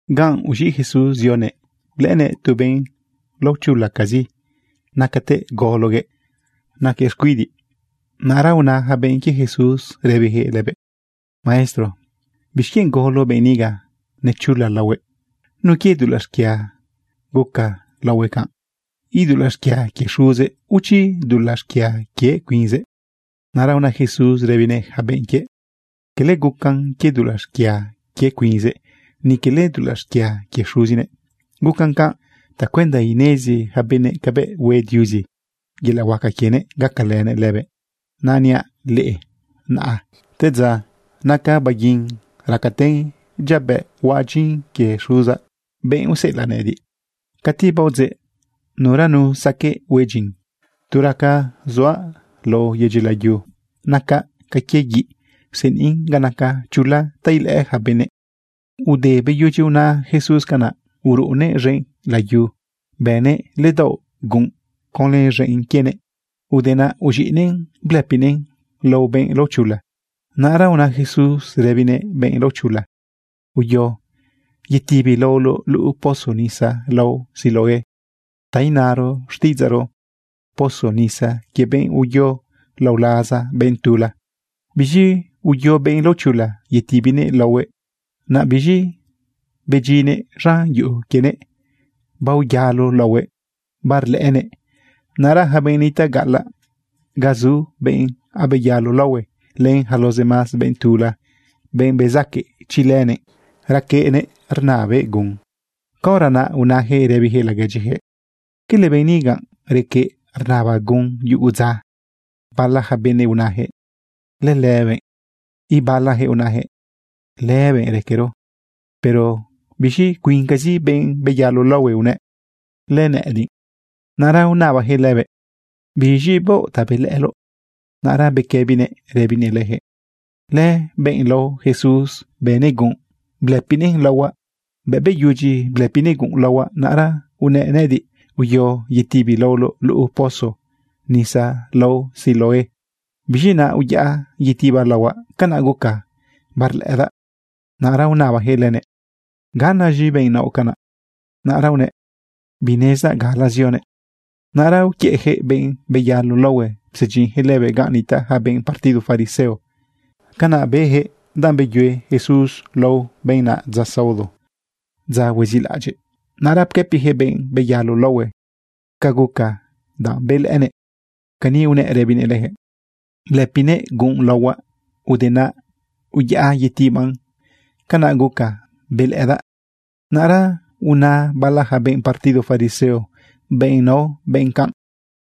Ganꞌ uz̃iꞌ Jesús zionëꞌ blëꞌënëꞌ tu benꞌ laochulacazi nacatëꞌ gologuëꞌ naquëꞌ xcuidiꞌ. Naꞌra una yaca benꞌ quie Jesús rëbiyaquëꞌ lëbëꞌ: ―Maestro, ¿bixquienꞌ golo benꞌ niga nechula laohuëꞌ? ¿Nu quie dulaꞌ xquia guca laohuëꞌ canꞌ? ¿Idulaꞌ xquia quie xuzëꞌ, o chi dulaꞌ xquia quie cuinzëꞌ? Naꞌra una Jesús rëbinëꞌ yaca benꞌ quiëꞌ: ―Cala gucan quie dulaꞌ xquia quie cuinzëꞌ, ni quele dulaꞌ xquia quie xuzinëꞌ. Gucan canꞌ tacuenda inezi yaca benëꞌ cabëꞌ hue Diuzi yelaꞌ huaca quienëꞌ gacalënëꞌ lëbëꞌ. Naꞌ niaꞌ leꞌe naꞌa te dza naca baguin racaten dyabëꞌ huaꞌ dyin quie Xuzaꞌ, benꞌ useꞌelaꞌ nëꞌëdiꞌ. Cati baodzeꞌ, nuranu saqueꞌ hue dyin. Tu raca zuaꞌ lao yedyi layu, nacaꞌ ca quie guiꞌ rseniꞌn ga naca chula ta ilëꞌë yaca benëꞌ. Ude beyudyi una Jesús canaꞌ, uruꞌunëꞌ z̃enꞌ layu, bënëꞌ ledaoꞌ gunꞌ conlë z̃enꞌ quienëꞌ. Ude naꞌ uz̃iꞌnëꞌn blëpinëꞌn lao benꞌ laochula. Naꞌra una Jesús rëbinëꞌ benꞌ laochula: ―Uyo yetibi laoloꞌ luꞌu pozo nisa lao Siloé, ta inaro xtiꞌidzaꞌro: Pozo nisa quie benꞌ uyo lao laza benꞌ tula. Biz̃i uyo benꞌ laochula yetibinëꞌ laohuëꞌ, naꞌ biz̃i bedyinnëꞌ z̃an yuꞌu quienëꞌ baoyalo laohuëꞌ barlëꞌënëꞌ. Naꞌra yaca benꞌ nitaꞌ gaꞌalaꞌ ga zu benꞌ abeyalo laohue, len yacara los demás benꞌ tula, benꞌ bezaque chi lënëꞌ requeꞌnëꞌ rnabëꞌ gun, caora naꞌ unayaquëꞌ rëbiyaquëꞌ laguedyiyaquëꞌ: ―¿Cala benꞌ niga requeꞌ rnaba gun yugu dza? Bala yaca benëꞌ unayaquëꞌ: ―Lëlëbëꞌ. Ibalayaquëꞌ unayaquëꞌ: ―Lëbëꞌ raquero. Pero biz̃i cuincazi benꞌ beyalo laohue unëꞌ: ―Lënëꞌëdiꞌ. Naꞌra unabayaquëꞌ lëbëꞌ: ―¿Biz̃i baoꞌ ta belëꞌëloꞌ? Naꞌra bequëbinëꞌ rëbinëꞌ leyaquëꞌ: ―Lëbenꞌ lao Jesús bënëꞌ gunꞌ blëpinëꞌn laohuaꞌ. Bëꞌ beyudyi blëpinëꞌ gunꞌ laohuaꞌ, naꞌra unëꞌ nëꞌëdiꞌ: “Uyo yetibi laoloꞌ luꞌu pozo nisa lao Siloé.” Biz̃i naꞌ uyaꞌa yetibaꞌ laohuaꞌ, canaꞌ gucaꞌ barlëꞌëdaꞌ. Naꞌra unabayaquëꞌ lënëꞌ: ―¿Ganaz̃i benꞌ naoꞌ canaꞌ? Naꞌra unëꞌ: ―Binezdaꞌ gala zionëꞌ. Naꞌra uquiëꞌyaquëꞌ benꞌ beyalo laohue psedyinyaquëꞌ lëbëꞌ ganꞌ nitaꞌ yaca benꞌ partido fariseo. Canaꞌ bëyaquëꞌ, danꞌ beyue Jesús laohue benꞌ naꞌ dza saodo, dza huezilaꞌadyiꞌ. Naꞌra pquëpiyaquëꞌ benꞌ beyalo laohue ca guca danꞌ belëꞌënëꞌ. Cani unëꞌ rëbinëꞌ leyaquëꞌ: ―Blëpiguëꞌ gunꞌ laohuaꞌ. Ude naꞌ uyaꞌa yetibaꞌn. Canaꞌ guca belëꞌëdaꞌ. Naꞌra una bala yaca benꞌ partido fariseo: ―Benꞌ naoꞌ bë canꞌ,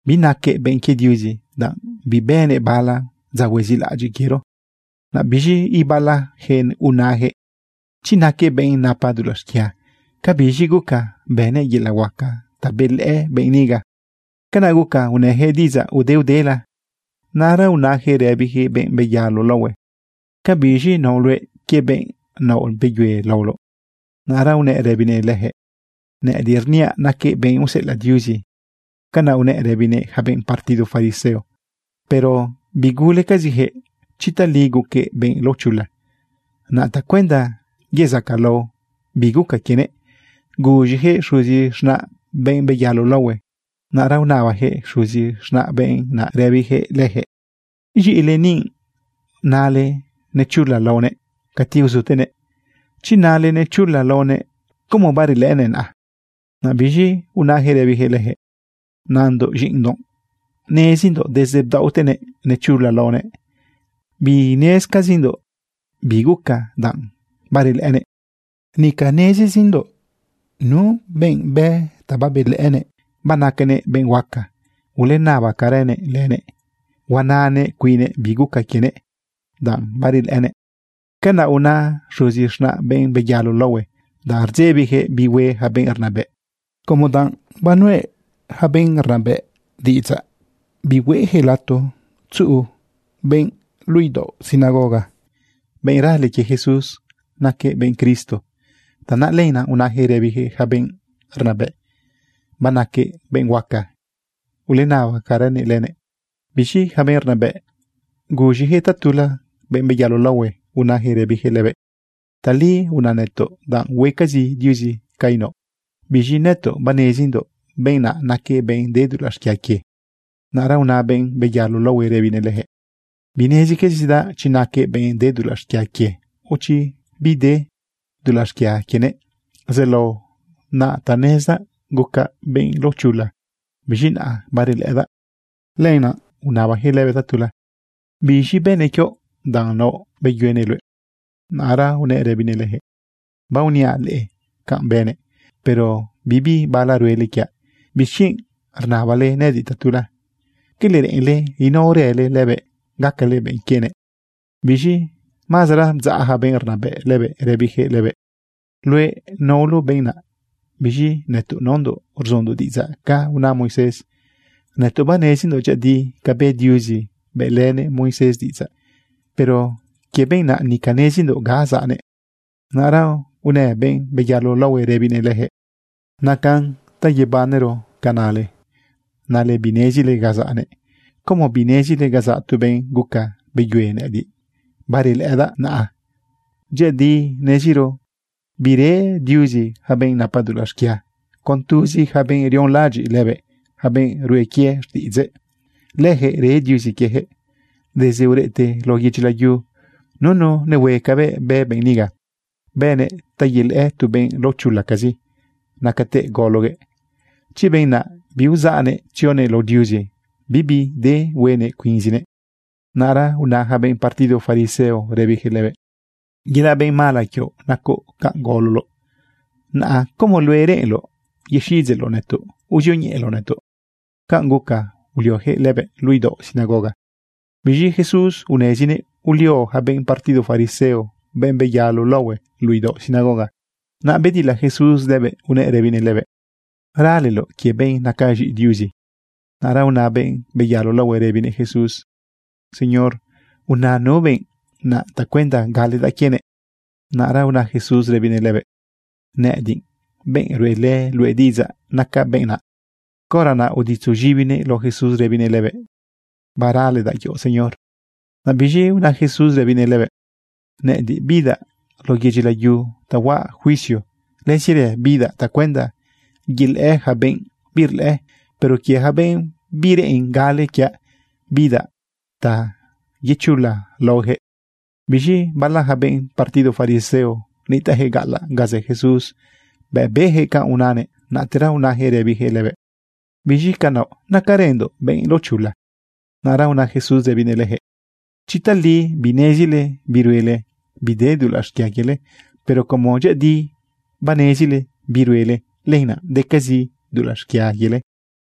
binaquëꞌ benꞌ quie Diuzi, danꞌ bibënëꞌ bala dza huezilaꞌadyiꞌ quiero. Naꞌ biz̃i ibalayaquëꞌ unayaquëꞌ: ―Chi naquëꞌ benꞌ napa dulaꞌ xquia, ¿cabiz̃i guca bënëꞌ yelaꞌ huaca ta belëꞌë benꞌ niga? Canaꞌ guca unëyaquëꞌ diꞌidzaꞌ udeudela. Naꞌra unayaquëꞌ rëbiyaquëꞌ benꞌ beyalo laohue: ―¿Cabiz̃i naoꞌ luëꞌ quie benꞌ naoꞌ beyue laoloꞌ? Naꞌra unëꞌ rëbinëꞌ leyaquëꞌ: ―Nëꞌëdiꞌ rniaꞌ naquëꞌ benꞌ useꞌelaꞌ Diuzi. ―Canaꞌ unëꞌ rëbinëꞌ yaca benꞌ partido fariseo. Pero bigulecaziyaquëꞌ chi tali guquëꞌ benꞌ laochula. Naꞌ tacuenda yezacalao bi guca quienëꞌ, guz̃iyaquëꞌ xuzi z̃naꞌ benꞌ beyalo laohue. Naꞌra unabayaquëꞌ xuzi z̃naꞌ benꞌ naꞌ rëbiyaquëꞌ leyaquëꞌ: ―¿Z̃iꞌile ni unale nechula laonëꞌ cati uzutenëꞌ? Chi nale nechula laonëꞌ, ¿cómo barlëꞌënëꞌ naꞌa? Naꞌ biz̃i unayaquëꞌ rëbiyaquëꞌ leyaquëꞌ: ―Nandoꞌ z̃iꞌindoꞌ. Nezindoꞌ desde bdaoꞌtenëꞌ nechula laonëꞌ. Binezcazindoꞌ bi guca danꞌ barlëꞌënëꞌ. Nica nezizindoꞌ nu benꞌ bë ta belëꞌënëꞌ. Banacanëꞌ benꞌ huaca. Ulenabacaranëꞌ lënëꞌ. Huananëꞌ cuinnëꞌ bi guca quienëꞌ danꞌ barelëꞌënëꞌ. Canaꞌ una xuzi z̃naꞌ benꞌ beyalo laohue, danꞌ rdzebiyaquëꞌ bi hue yaca benꞌ rnabëꞌ, como danꞌ banuz̃iꞌa yaca benꞌ rnabëꞌ bihueꞌyaquëꞌ lato tzuꞌu benꞌ luꞌu idaoꞌ sinagoga, benꞌ rale quie Jesús naquëꞌ benꞌ Cristo. Tanaꞌ lenaꞌ unayaquëꞌ rëbiyaquëꞌ yaca benꞌ rnabëꞌ: “Banaquëꞌ benꞌ huaca. Ulenabacaranëꞌ lënëꞌ.” Biz̃i yaca benꞌ rnabëꞌ guz̃iyaquëꞌ tatula benꞌ beyalo laohue, unayaquëꞌ rëbiyaquëꞌ lëbëꞌ: ―Tali una nëtoꞌ, danꞌ huecazi Diuzi ca inaoꞌ. Biz̃i nëtoꞌ banezindoꞌ benꞌ naꞌ naquëꞌ benꞌ de dulaꞌ xquia quie. Naꞌra una benꞌ beyalo laohue rëbinëꞌ leyaquëꞌ: ―Binezicazidaꞌ chi naquëꞌ benꞌ de dulaꞌ xquia quie, o chi bede dulaꞌ xquia quienëꞌ. Zelao naꞌ ta nezdaꞌ, gucaꞌ benꞌ laochula, biz̃i naꞌa barelëꞌëdaꞌ. Lenaꞌ unabayaquëꞌ lëbëꞌ tatula: ―¿Biz̃i bënëꞌ quioꞌ danꞌ naoꞌ beyuenëꞌ luëꞌ? Naꞌra unëꞌ rëbinëꞌ leyaquëꞌ: ―Baoniaꞌ leꞌe canꞌ bënëꞌ, pero bibi bala ruele quiaꞌ. ¿Bixquienꞌ rnabale nëꞌëdiꞌ tatula? ¿Cala reꞌenle inaorële lëbëꞌ, gacale benꞌ quienëꞌ? Biz̃i mazara bdzaꞌ yaca benꞌ rnabëꞌ lëbëꞌ rëbiyaquëꞌ lëbëꞌ: ―Luëꞌ naoloꞌ benꞌ naꞌ. Biz̃i nëtoꞌ naondoꞌ rzundoꞌ diꞌidzaꞌ ca una Moisés. Nëtoꞌ banezindoꞌ dyëꞌëdi ca bë Diuzi bëꞌlënëꞌ Moisés diꞌidzaꞌ. Pero quie benꞌ naꞌ, nica nezindoꞌ ga zaꞌnëꞌ. Naꞌra unë benꞌ beyalo laohue rëbinëꞌ leyaquëꞌ: ―Nacan ta yebanero ca nale, nale binezile ga zaꞌnëꞌ. ¿Cómo binezile ga zaꞌ tu benꞌ guca beyuenëꞌ nëꞌëdiꞌ barlëꞌëdaꞌ naꞌa? Dyëꞌëdi neziro bire Diuzi yaca benꞌ napa dulaꞌ xquia. Con tuzi yaca benꞌ rionlaꞌadyiꞌ lëbëꞌ, yaca benꞌ rue quie xtiꞌidzëꞌ, lëjëꞌ re Diuzi quiejëꞌ. Desde ureꞌte lao yedyi layu, nunu nehue cabëꞌ bë benꞌ niga, bënëꞌ ta yelëꞌë tu benꞌ laochulacazi nacatëꞌ gologuëꞌ. Chi benꞌ naꞌ biuzaꞌnëꞌ tzionëꞌ lao Diuzi, bibi de huenëꞌ cuinzinëꞌ. Naꞌra una yaca benꞌ partido fariseo rëbiyaquëꞌ lëbëꞌ: ―Yelaꞌ benꞌ mala quioꞌ nacoꞌ canꞌ gololoꞌ. ¿Naꞌ como luëꞌ reꞌenloꞌ yexiꞌidzeꞌloꞌ nëtoꞌ uzioñeꞌeloꞌ nëtoꞌ? Canꞌ guca ulioyaquëꞌ lëbëꞌ luꞌu idaoꞌ sinagoga. Biz̃i Jesús unezinëꞌ ulio yaca benꞌ partido fariseo benꞌ baoyalo laohue luꞌu idaoꞌ sinagoga. Naꞌ bedila Jesús lëbëꞌ unëꞌ rëbinëꞌ lëbëꞌ: ―¿Raleloꞌ quie benꞌ naca z̃iꞌi Diuzi? Naꞌra una benꞌ baoyalo laohue rëbinëꞌ Jesús: ―Señor, una nu benꞌ naꞌ tacuenda galedaꞌ quienëꞌ. Naꞌra una Jesús rëbinëꞌ lëbëꞌ: ―Nëꞌëdiꞌ, benꞌ ruꞌelë luëꞌ diꞌidzaꞌ, nacaꞌ benꞌ naꞌ. Caora naꞌ uditzo z̃ibinëꞌ lao Jesús rëbinëꞌ lëbëꞌ: ―Baraledaꞌ quioꞌ, Señor. Naꞌ biz̃i una Jesús rëbinëꞌ lëbëꞌ: ―Nëꞌëdiꞌ bidaꞌ lao yedyi layu ta huaꞌ juicio. Lëzirë bidaꞌ tacuenda yelëꞌë yaca benꞌ birlëꞌë. Pero quie yaca benꞌ bireꞌen gale quiaꞌ, bidaꞌ ta yechula laohueyaquëꞌ. Biz̃i bala yaca benꞌ partido fariseo nitaꞌyaquëꞌ gaꞌalaꞌ ga zë Jesús, bëꞌ beyaquëꞌ canꞌ unanëꞌ, naꞌtera unayaquëꞌ rëbiyaquëꞌ lëbëꞌ: ―¿Biz̃i ca naoꞌ? ¿Nacarëndoꞌ benꞌ laochula? Naꞌra una Jesús rëbinëꞌ leyaquëꞌ: ―Chi tali binezile bi ruele, bide dulaꞌ xquia quiele. Pero como dyëꞌëdi banezile bi ruele, lenaꞌ decazi dulaꞌ xquia quiele.